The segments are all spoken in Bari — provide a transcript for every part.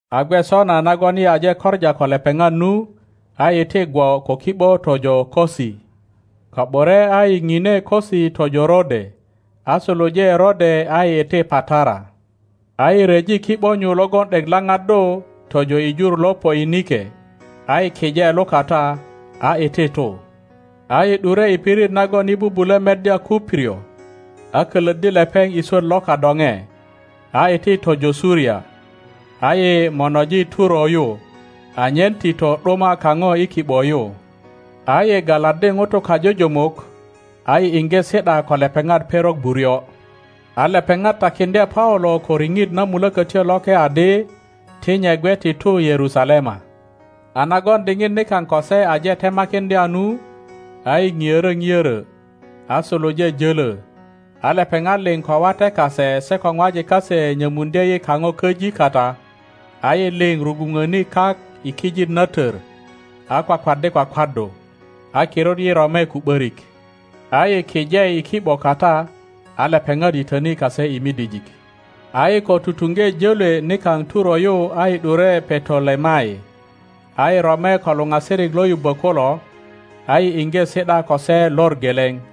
A gwe sona nagon yi aje koŋa ko lepeŋat nu, a yi iti gwo ko ki ’bo tojo Kosi; ko ’bure a yi pine Kosi tojo Rode, a suluje Rode a yi iti Patara. a yi ryeji ki ’bo nyu logon ’dek laŋaddu tojo i jur lo Poinike, a yi kije lukata, a iti tu. a yi ’dure i pirit nagon yi bubulö meddya Kuprio, a kölöddi lepeŋ i swöt lo kadoŋe, a iti tojo Suria, a yi monoji Turo yu, anyen tito ’duma kaŋo i ki ’bo yu. a yi galaddi ŋutu kajujumuk, a yi iŋge si ’da ko lepeŋat perok buryo. A lepeŋat takiŋdye Paulo ko riŋit na Mulokötyo Loke adi ti nye gwe ti tu Yerusalema. A nagon diŋit nikaŋ ko se aje temakiŋdya nu, a yi ŋiorö o ’brö, a suluje jölö, a lepeŋat liŋ ko wate kase se ko ŋwajik kase nyömuŋdye yi kaŋo köji kata, a yi liŋ rugwuŋöni kak i kijit na tör, a kwakwaddi kwakwaddu. A kirut yi rome ko ’börik, a yi kije i ki ’bo kata, a lepeŋat yitöni kase i midijik. A yi ko tutuŋge jölwe nikaŋ Turo yu a yi ’dure Petolemai, a yi rome ko luŋasirik lo yubbö kulo, a yi iŋge si ’da ko se lor geleŋ.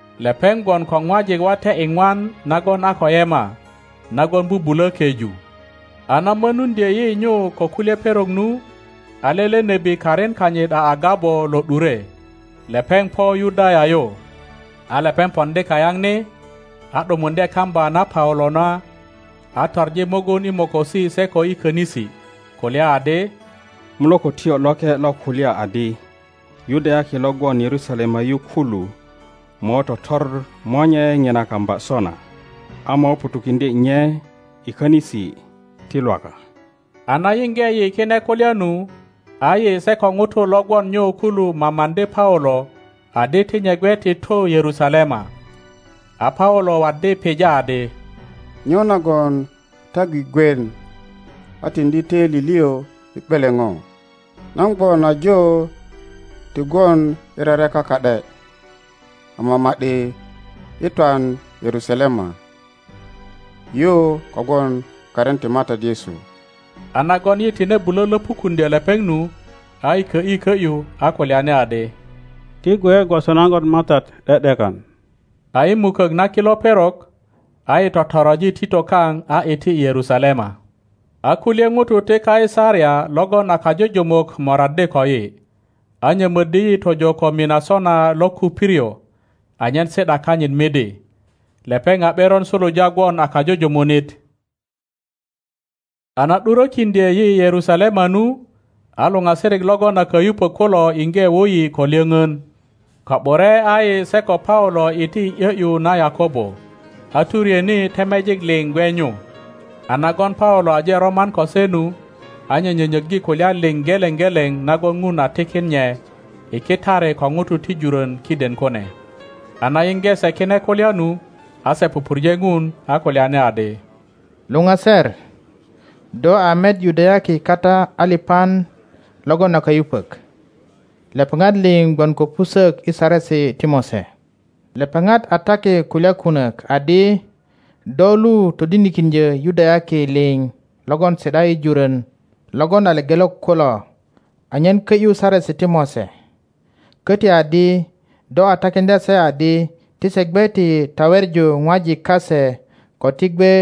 Lepeŋ gwon ko ŋwajik wate iŋwan nagon a ko yema, nagon bubulö keju. A na mönuŋdye yi nyu ko kulye perok nu, a lele nebi karin kanyit a Agabo lo ’dure, lepeŋ po Yudaya yu. A lepeŋ poŋdi kayaŋ ni, a ’dumuŋdye kamba na Pajilo na, a toŋi mugun i mokosi se ko i könisi, kulya adi, Mulökötyo Loke lo kulya adi, Yudayaki lo gwon Yerusalema yu kulu mo totor monye ŋina kamba sona, a mo ŋutukiŋdye nye i könisi ti Lwaka. A na yiŋge yi kine kulya nu, a yi se ko ŋutu lo gwon nyu kulu mamaŋdi Paulo adi ti nye gwe ti tu Yerusalema. a Paulo waddi pija adi, Nyo nagon ta gwigwien a tiŋdi töili liŋ i ’beleŋo? Nan gwon ajo ti gwon i rereka ka ’de, ama ma ’di i twan Yerusalema yu kogwon karin ti Matat Yesu. A nagon yi tine bulö löpukuŋdyö lepeŋ nu, a yi kö ’yi kö ’yu a kulyani adi, Ti gwe gwoso nagon Matat ’de ’dekan. A i mukök na kilo perok, a yi totoroji tito kaŋ a iti Yerusalema. A kulye ŋutu ti Kaisaria logon a kajujumuk moraddi koyi, a nyömöddi yi tojo ko Minasona lo Kuprio anyen si ’da kanyit midi. Lepeŋ a ’beron suluja gwon a kajujumunit. A na ’durökiŋdye yi Yerusalema nu, a luŋasirik logon a kayupök kulo iŋge wu yi ko lyoŋön. Ko ’bure a yi se ko Paulo iti i ’yö ’yu na Yakobo, a turyeni temejik liŋ gwe nyu. A nagon Paulo aje roman ko se nu, a nye nyönyöggi kulya liŋ geleŋ geleŋ nagon Ŋun a tikin nye i kitari ko ŋutu ti jurön kiden kune. a na yiŋge se kine kulya nu, a se pupurje Ŋun, a kulyani adi, luŋaser, do a met Yudayaki kata aliŋan logon a kayupök, lepeŋat liŋ gwon ko pusök i Saresi ti Mose. Lepeŋat a taki kulya kunök adi do lu todinikiŋdyö Yudayaki liŋ logon si ’da i jurön logon a lepelok kulo anyen kö ’yu Saresi ti Mose, köti adi do a takiŋdya se adi ti se gwe ti taweŋu ŋwajik kase ko ti gwe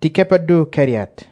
ti kepoddu keriat.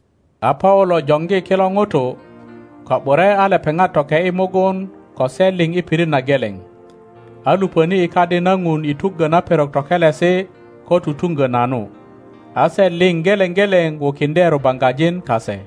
A Paulo joŋgi kilo ŋutu, ko ’bure a lepeŋ toke ’yi mugun ko se liŋ i pirit na geleŋ, a luŋöni i kadi na Ŋun i tuggö na perok tokelesi ko tutuŋgö nanu, a se liŋ geleŋ geleŋ wukiŋdye rubaŋgajin kase.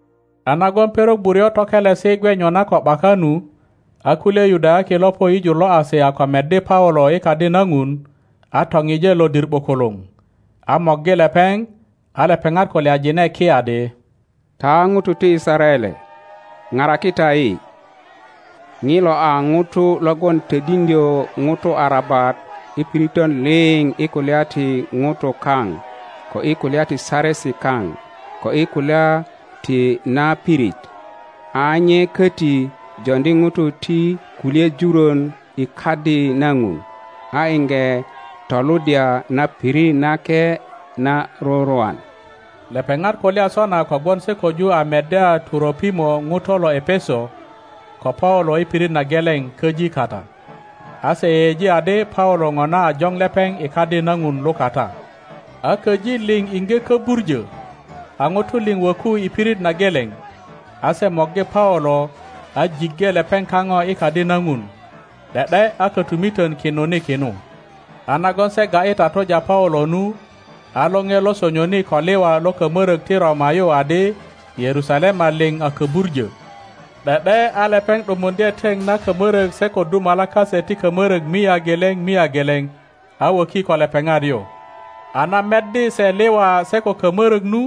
A nagon perok buryo tokelesi gwe nyona ko ’baka nu, a kulye Yudayaki lo po i jur lo Asia ko meddi Paulo i Kadi na Ŋun, a topije lodir ’bukuluŋ, a morgi lepeŋ, a lepeŋat kulyajine ki adi, Ta ŋutu ti Yisaraele, paraki ta yi! Ŋilo a ŋuto logon todiŋdyö ŋutu arabat i piritön liŋ i kulya ti ŋutu kaŋ ko i kulya ti Saresi kaŋ ko i kulya ti na pirit; a nye köti joŋdi ŋutu ti kulye jurön i Kadi na Ŋun, a iŋge toluddya na pirit nake na rurwan. Lepeŋat kulya sona kogwon se köju a meddya Turopimo ŋuto lo Epeso ko Paulo i pirit na geleŋ köji kata, a se yeyeji adi Paulo ŋona a joŋ lepeŋ i Kadi na Ŋun lukata. A köji liŋ iŋge köbuŋö, a ŋutu liŋ wöku i pirit na geleŋ, a se morgi Paulo a jiŋge lepeŋ kaŋo i Kadi na Ŋun, ’de ’de a kotumiton kinuni kinu. A nagon se ga ’yi tatuja Paulo nu, a lore lo sonyoni ko liwa lo kamörök ti Roma yu adi Yerusalema liŋ a köbuŋo. ’De ’de a lepeŋ ’dumuŋdye teŋ na kamörök se ko dumalak kase ti kamörök mia geleŋ mia geleŋ, a woki ko lepeŋat yu. A na meddi se liwa se ko kamörök nu,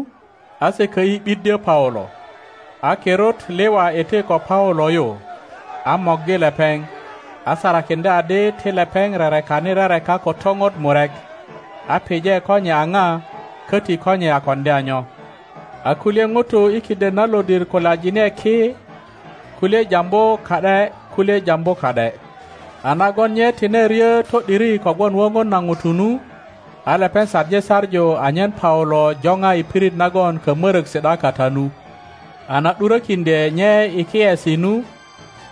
a se kö ’yi ’biddyö Paulo. A kirut liwa iti ko Paulo yu, a morgi lepeŋ, a sarakiŋdye adi ti lepeŋ rerekani rereka ko topot murek, a pije ko nye a pa köti ko nye a koŋdya nyo. A kulye ŋutu i kiden na lodir kulyajine ki, kulye jambu ka ’de kulye jambu ka ’de; a nagon nye tine ryö to ’diri kogwon woŋon na ŋutu nu, a lepeŋ saŋi saŋu anyen Paulo jopa i pirit nagon kamörök si ’da kata nu. A na ’durökiŋdye nye i kiyesi nu,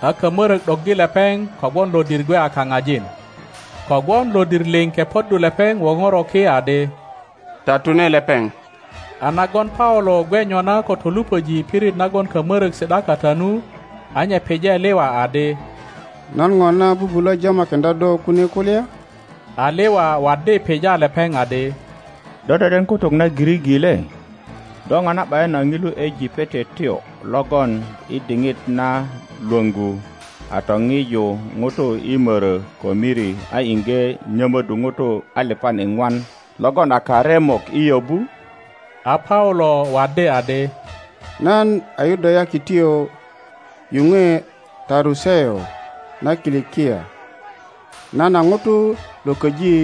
a kamörök ’doggi lepeŋ kogwon lodir gwe a kaŋajin. Kogwon lodir liŋ kepoddu lepeŋ woŋoro ki adi, Tatune lepeŋ! A nagon Paulo gwe nyona ko toluŋöji i pirit nagon kamörök si ’da kata nu, a nye pije liwa adi, Nan ŋona bubulö jamakiŋdya do kune kulya? A liwa waddi pija lepeŋ adi, Do deden kutuk na Giriki le? Do ŋona ’bayin a ŋilu Ejipetotyo logon i diŋit na lwöŋgu a topiju ŋutu i mörö ko miri a iŋge nyömöddu ŋutu aliŋan iŋwan logon a karemok i yöbu? a Paulo waddi adi, Nan a Yudayakityo yuŋwe Taruseu na Kilikia, nan a ŋuto lo köji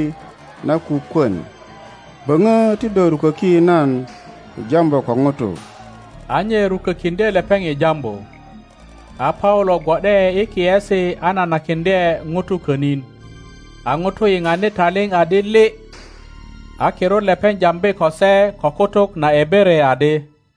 na kukwön. Böŋö ti do ruköki nan i jambu ko ŋutu. a nye rukökiŋdye lepeŋ i jambu. A Paulo gwo ’de i kiyesi a nanakiŋdye ŋutu könin, a ŋutu yiŋani taliŋ adi lii, a kirut lepeŋ jambi ko se ko kutuk na Ebere adi,